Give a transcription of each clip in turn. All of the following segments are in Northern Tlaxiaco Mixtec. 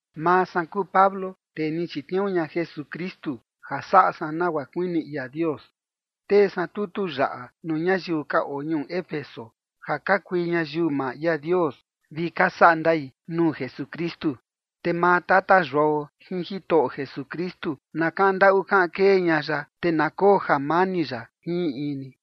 Maa san kuu Pablo, tee ni chitniuu ña Jesukristu ja saꞌa san nagua kuini ia Dios, tee san tutu yaꞌa nuu ñayiu ka oo ñuu Éfeso ja ka kui ñayiu maa ia Dios vi ka saꞌa ndai nuu Jesukristu. Te maa Tata Yuao jin Jitoꞌo Jesukristu na kaꞌan ndaꞌu kaꞌan kee ña ya, te na koo jamani ya jin in in ni.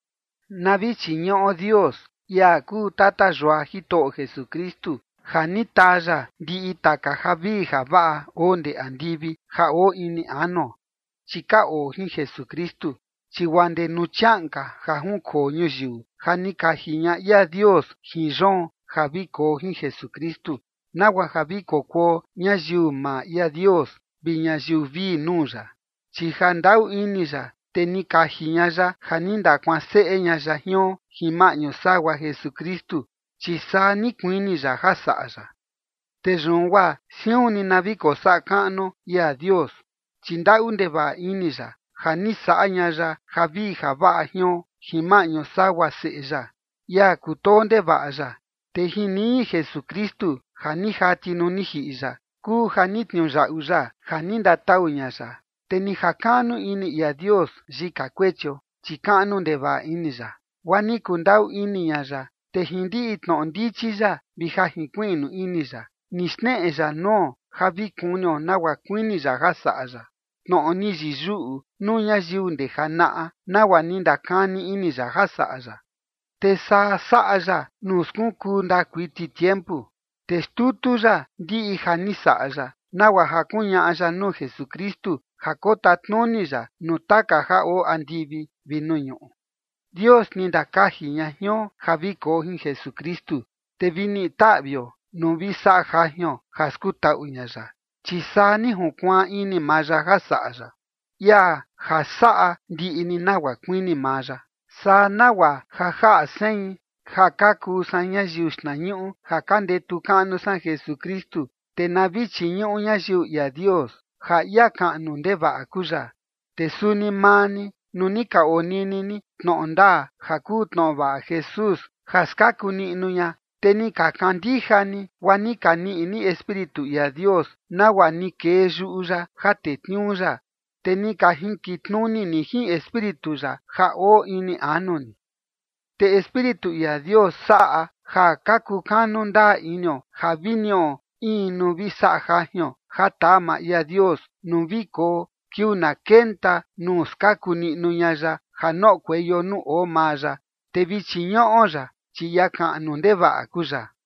Na vi chiñuꞌo Dios, ia kuu tata yua Jitoꞌo Jesukristu, ja ni taa ya ndiꞌi taka javii javaꞌa oo ndee andivi ja oo ini anuo, chi ka oo jin Jesukristu. Chi guaa ndee nuu chiaꞌan ka ja junkoo ñuyiu, ja ni kaji ña ia Dios jin yoon ja vi koo jin Jesukristu, nagua ja vi kokuo ñayiu maa ia Dios vi ñayiu vii nuu ya. Chi ja ndaꞌu ini ya, te ni kaji ña ya ja ni ndakuanseꞌe ña ya jion jin maꞌñu sagua Jesukristu, chi saa ni kuini ya ja saꞌa ya. Te yun guaa siun ni na vi kosaꞌa kaꞌnuo ia Dios, chi ndaꞌu ndevaꞌa ini ya, ja ni saꞌa ña ya javii javaꞌa jion jin maꞌñu sagua Seꞌe ya, ia kutoo ndevaꞌa ya. Te jin niñi Jesukristu ja ni jati nuu ni jiꞌi ya, kuu ja ni tniuyaꞌu ya ja ni ndatau ña ya, te ni jakaꞌnu ini ia Dios yika kuechio, chi kaꞌnu ndevaꞌa ini ya, guaa ni kundaꞌu ini ña ya. Te jin ndiꞌi tnoꞌo ndichi ya vi ja jinkuiꞌnu ini ya, ni xneꞌe ya nuo ja vi kunio nagua kuini ya ja saꞌa ya, tnoꞌo ni yiyuꞌu nuu ñayiu ndee janaꞌa, nagua ni ndakani ini ya ja saꞌa ya. Te saa saꞌa ya nuu skunkuu ndaa kuiti tiempu. Te xtutu ya ndiꞌi ja ni saꞌa ya, nagua ja kuñaꞌa ya nuu Jesukristu ja kotatnuni ya nuu taka ja oo andivi vi nuu ñuꞌu. Dios ni ndakaji ña jion ja vi koo jin Jesukristu, te vi niꞌi taꞌvio nuu vi saꞌa jajion ja skutaꞌu ña ya, chi saa ni junkuaan ini maa ya ja saꞌa ya, ia ja saꞌa ndiꞌi ni nagua kuini maa ya. Saa nagua ja jaꞌa sein ja ka kuu san ñayiu xtnañuꞌu ja ka ndetu kaꞌnu san Jesukristu, te na vi chiñuꞌu ñayiu ia Dios, ja ia kaꞌnu ndevaꞌa kuu ya. Te suni maa ni, nuu ni ka onini ni tnoꞌo ndaa ja kuu tnoꞌo vaꞌa Jesús ja skaku niꞌnu ña, te ni ka kandija ni, guaa ni ka niꞌi ni Espíritu ia Dios, nagua ni kee yuꞌu ya ja tetniuu ya. Te ni ka jinkitnuni ni jin Espíritu ya ja oo ini anu ni. Te Espíritu ia Dios saꞌa ja ka kukanu ndaa inio ja vi niꞌo in nuu vi saꞌa jajion ja taa maa ia Dios nuu vi koo kiuu na kenta nuu skaku niꞌnu ña ya ja noꞌokueio nuu oo maa ya, te vi chiñuꞌo ya, chi ia kaꞌnu ndevaꞌa kuu ya.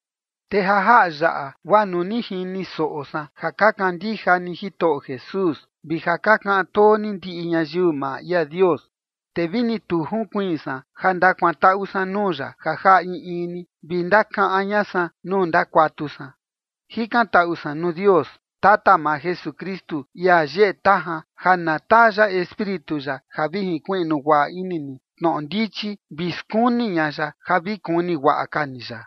Te ja jaꞌa yaꞌa guaa nuu ni jini soꞌo san ja ka kandija ni Jitoꞌo Jesús vi ja ka kaꞌan too ni ndiꞌi ñayiu maa ia Dios, te vini tu junkuiin san ja ndakuantaꞌu san nuu ya ja jaꞌa in in ni vi ndakaꞌan ña san nuu ndakuatu san. Jikantaꞌu san nuu Dios, Tata maa Jesukristu, ia yeꞌe tajan, ja na taa ya Espíritu ya ja vi jinkuiꞌnu guaꞌa ini ni tnoꞌo ndichi vi skuni ña ya ja vi kuni guaꞌa ka ni ya.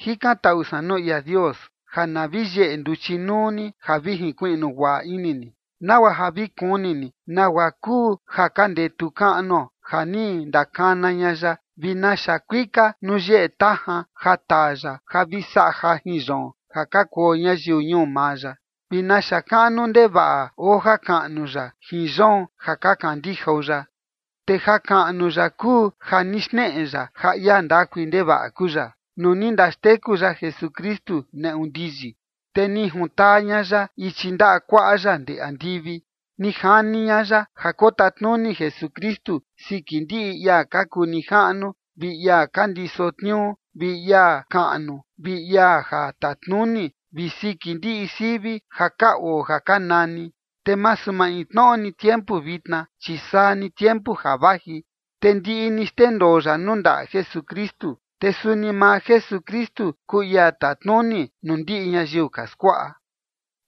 Jikantaꞌu san nuu ia Dios ja na vi yeꞌe nduchi nuu ni ja vi jinkuiꞌnu guaꞌa ini ni, nagua ja vi kuni ni nagua kuu ja ka ndetu kaꞌnuo ja ni ndakana ña ya, vi naxa kuika nuu yeꞌe tajan ja taa ya ja vi saꞌa jajin yoon, ja ka kuo ñayiu ñuu maa ya, vi naxa kaꞌnu ndevaꞌa oo jakaꞌnu ya jin yoon ja ka kandijao ya. Te jakaꞌnu ya kuu ja ni xneꞌe ya ja ia ndakui ndevaꞌa kuu ya, nuu ni ndaxteku ya Jesukristu neꞌu ndiyi, te ni juntaa ña ya ichi ndaꞌa kuaꞌa ya ndee andivi. Ni jani ña ya ja kotatnuni Jesukristu siki ndiꞌi ia ka kuu nijaꞌnu vi ia ka ndiso tniuu vi ia kaꞌnu vi ia ja tatnuni, vi siki ndiꞌi sivi ja ka oo ja ka nani, te masu maintnoꞌo ni tiempu vitna, chi saa ni tiempu ja vaji. Te ndiꞌi ni xndendoo ya nuu ndaꞌa Jesukristu, te suni maa Jesukristu kuu ia tatnuni nuu ndiꞌi ñayiu ka skuaꞌa.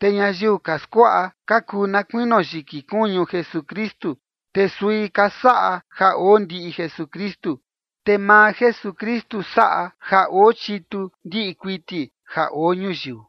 Te ñayiu ka skuaꞌa ka kuu na kuinio yiki kuñu Jesukristu, te sui ka saꞌa ja oo ndiꞌi Jesukristu, te maa Jesukristu saꞌa ja oo chitu ndiꞌi kuiti ja oo ñuyiu.